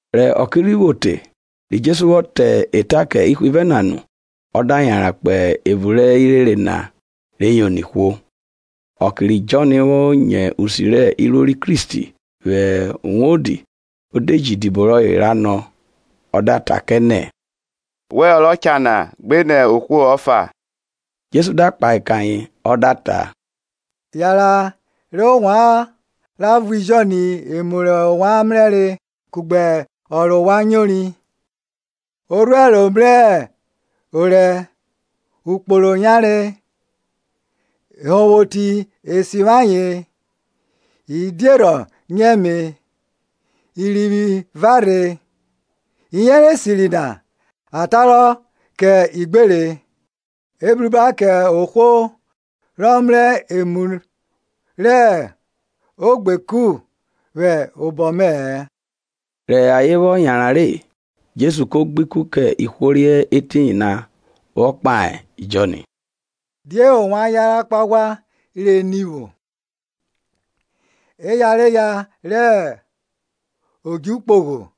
Rẹ oke rhi vwo te, ri Jesu vwọ ta eta kẹ ihwivẹ na nu, ọ da yanran kpo evun rẹ irere na re yono ihwo. Ọke ri Jọn vwo nyo usi rẹ iruo ri Kristi vwẹ uwodi, o de ji idibo rọye ra nọ. Ọ da ta kẹ nẹ, Wẹ ọ ro cha na, gbinẹ ohwo ọfa? Jesu da kpahe kẹ ayen ọ da ta, Yanran re ovwan ra vuẹ Jọn emu rẹ ovwan mrẹre kugbe ọ rẹ ovwan nyori; orhuẹro mrẹ orẹ, okpolo yanre, ehonvwoti e sivwi ayen, idierhọ nyo ẹme, irivwi vrẹre, iyẹnrẹ esiri na eghwoghwiro kẹ igbere. Ebruba kẹ ohwo rọ mrẹ emu rẹ ogbeku vwẹ obọ mẹ-ẹ. Rọ ayen vwọ yanran re, Jesu ko gbe ikun kẹ ihwo re hẹ etiyin na vwọ kpahe Jọn, Die ovwan yanran kpo aghwa rẹ ni vwo? eyareya rẹ odju kpogho?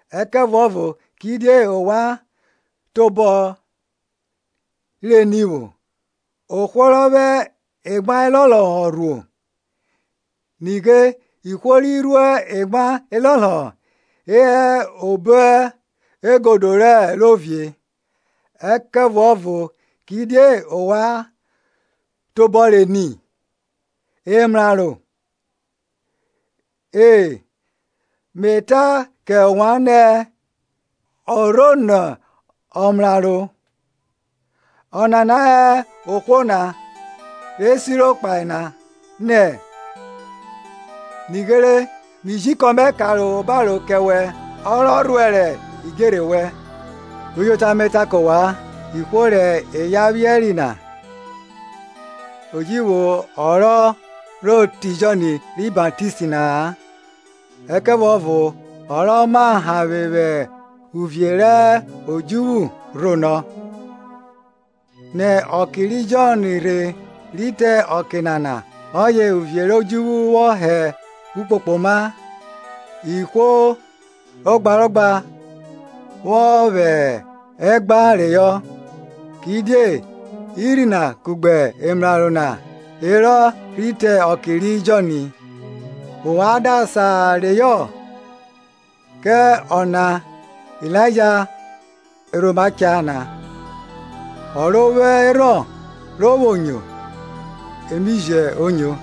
Ẹkẹvuọvo kidie ovwan tobọ re ni vwọ? Ohwo rọ vwẹ emwa elọlọhọ rhuo? Nighe ihwo ri rhuo emwa elọlọhọ e hẹ obo egodo rẹ ovie. Ẹkẹvuọvo kidie ovwan tobọ re ni? emraro? E, Me ta kẹ ovwan nẹ, ọ rọ rho nẹ ọmraro. Ọnana hẹ ohwo na, re siro kpahe nẹ, Nighe mi ji ikọn mẹ ka obaro kẹ wẹ, Ọ rọ rhuẹrẹ idjerhe wẹn. Uyota me ta kẹ ovwan, Ihwo rẹ eya vwiẹri na, o ji vwo ọ rọ rhoro te Jọn ri Baptist na-a, ẹkẹvuọvo ọ rọ ma hanvwe vwẹ uvie rẹ odjuvwu rho nọ. Nẹ ọke ri Jọn rhe rhi te ọke nana ọye uvie rẹ odjuvwu vwọ hẹ ukpokpogho, ihwo ogbarogba vwọ vwẹ ẹgba reyọ. Kidie irhi na kugbe emraro na herọ rhi te ọke ri Jọn. Ovwan da sa reyọ, kẹ ọ na Ilaija rọ rhoma cha na. Ọ ro vwo erhọn ro vwo nyo ẹme e jo nyo.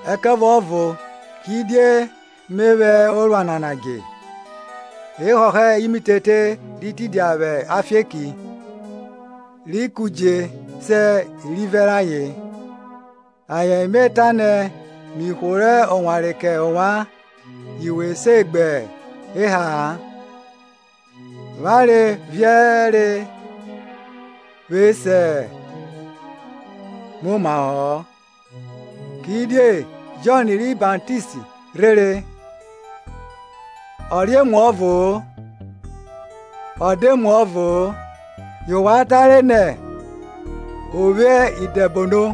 Ẹkẹvuọvo kidie me vwẹ orua nana dje? E họhọ imitete ri tidia vwẹ afieki, ri kudje se irivẹ rayen; ayen me ta nẹ, mi hworo owanre kẹ ovwan yu we se gbe eha-a, avwanre viẹre we se muomahọ-ọ; Kidie Jọn ri Baptist rhere, ọ re emuọvo-o, ọ da emuọvo-o, yẹ ovwan tare nẹ, o vwo idẹbono.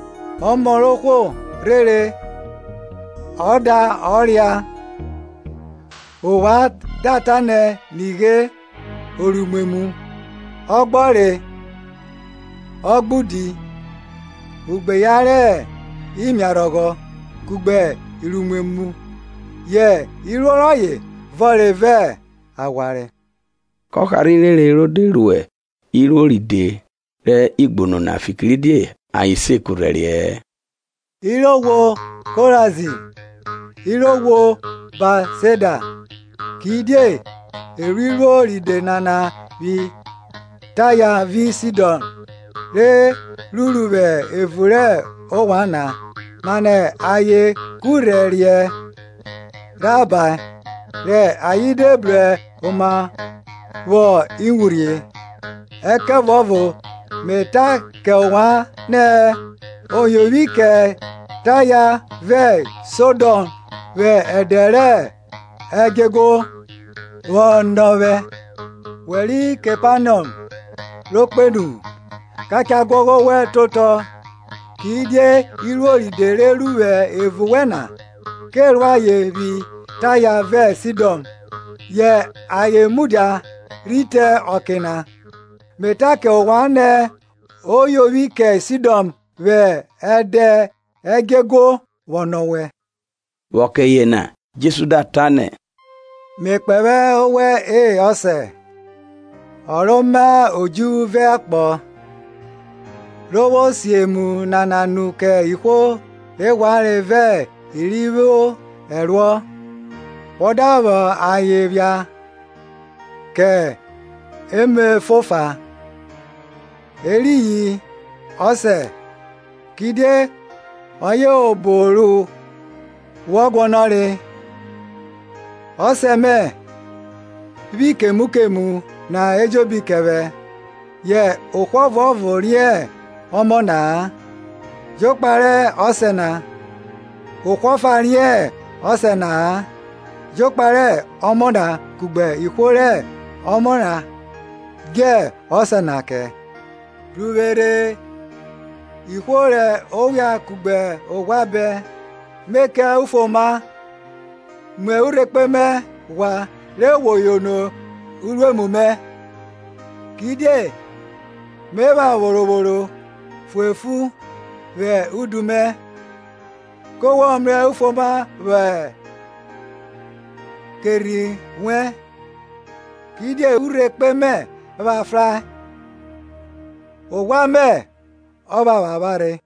Ọmọ rẹ ohwo rhere ọ da ọ ria, ovwan da ta nẹ, Nighe oruimwemwu, ọgbọre, ọgbaudi, ugbeyan rẹ imiarhọghọ kugbe iruimwemwu yẹ iruo rọye vọnre vẹ aghwanre. Kọ harha irere ro de ru iruo ride rẹ igbunu na, fikiridie ayen se kurhẹriẹ-ẹ. Iraghwo korazini Iraghwo Betsaida kidie e ru iruo ride nana vwi Taya vi Sidọn, re ruru vwẹ evun rẹ ovwan na, mane ayen kurhẹriẹ rhabae, rẹ ayen de bru oma vwọ iwurhie. Ẹkẹvuọvo me ta kẹ ovwan nẹ, o yovwi kẹ Taya vẹ Sidọn vwẹ ẹdẹ rẹ edjọeguo vwọ nọ wẹ. We ri Kepanọm ro kpenu? ka cha guọghọ owẹ te otọ; kidie iruo ride re ruru vwẹ evun wẹ na, ke ru ayen vwi Taya vẹ Sidọn, yẹ ayen mudia rhi te ọke na. Me ta kẹ ovwan nẹ, o yovwi kẹ Sidọn vwẹ ẹdẹ ẹdjọeguo vwọ nọ wẹ. Vwẹ ọke yena Jesu da ta nẹ, Me kpẹvwẹ owẹ E Ọsẹ, Ọ ro ma odjuvwu vẹ akpọ, re vwo si emu nana nu kẹ ihwo rẹ ghwanre vẹ i ri vwo ẹruọ, wọ da vwọ ayen phia kẹ emọboba. Eriyin, Ọsẹ, kidie ọye obo ru wọ guọnọre. Ọsẹ mẹ vwi kemu kemu na ejobi kẹ vwẹ, yẹ ohwo ọvuọvo riẹn ọmọ na-a, jokpa rẹ Ọsẹ na; ohwo ọfa riẹn Ọsẹ na-a, jokpa rẹ Ọmọ na kugbe ihwo rẹ Ọmọ na dje Ọsẹ na kẹ. Bru vwe rhe ihwo rẹ owian kugbe oghwa bẹn, Me kẹ ovwan ufuoma. Mu urhekpe mẹ ghwa re wo yono uruemu mẹ; kidie me pha vworovworo fuefu vwẹ udu mẹ, kẹ wo mrẹ ufuoma vwọ kẹ erhi wẹn. Kidie urhekpe mẹ pha frae, oghwa mẹ ọ phapharhe.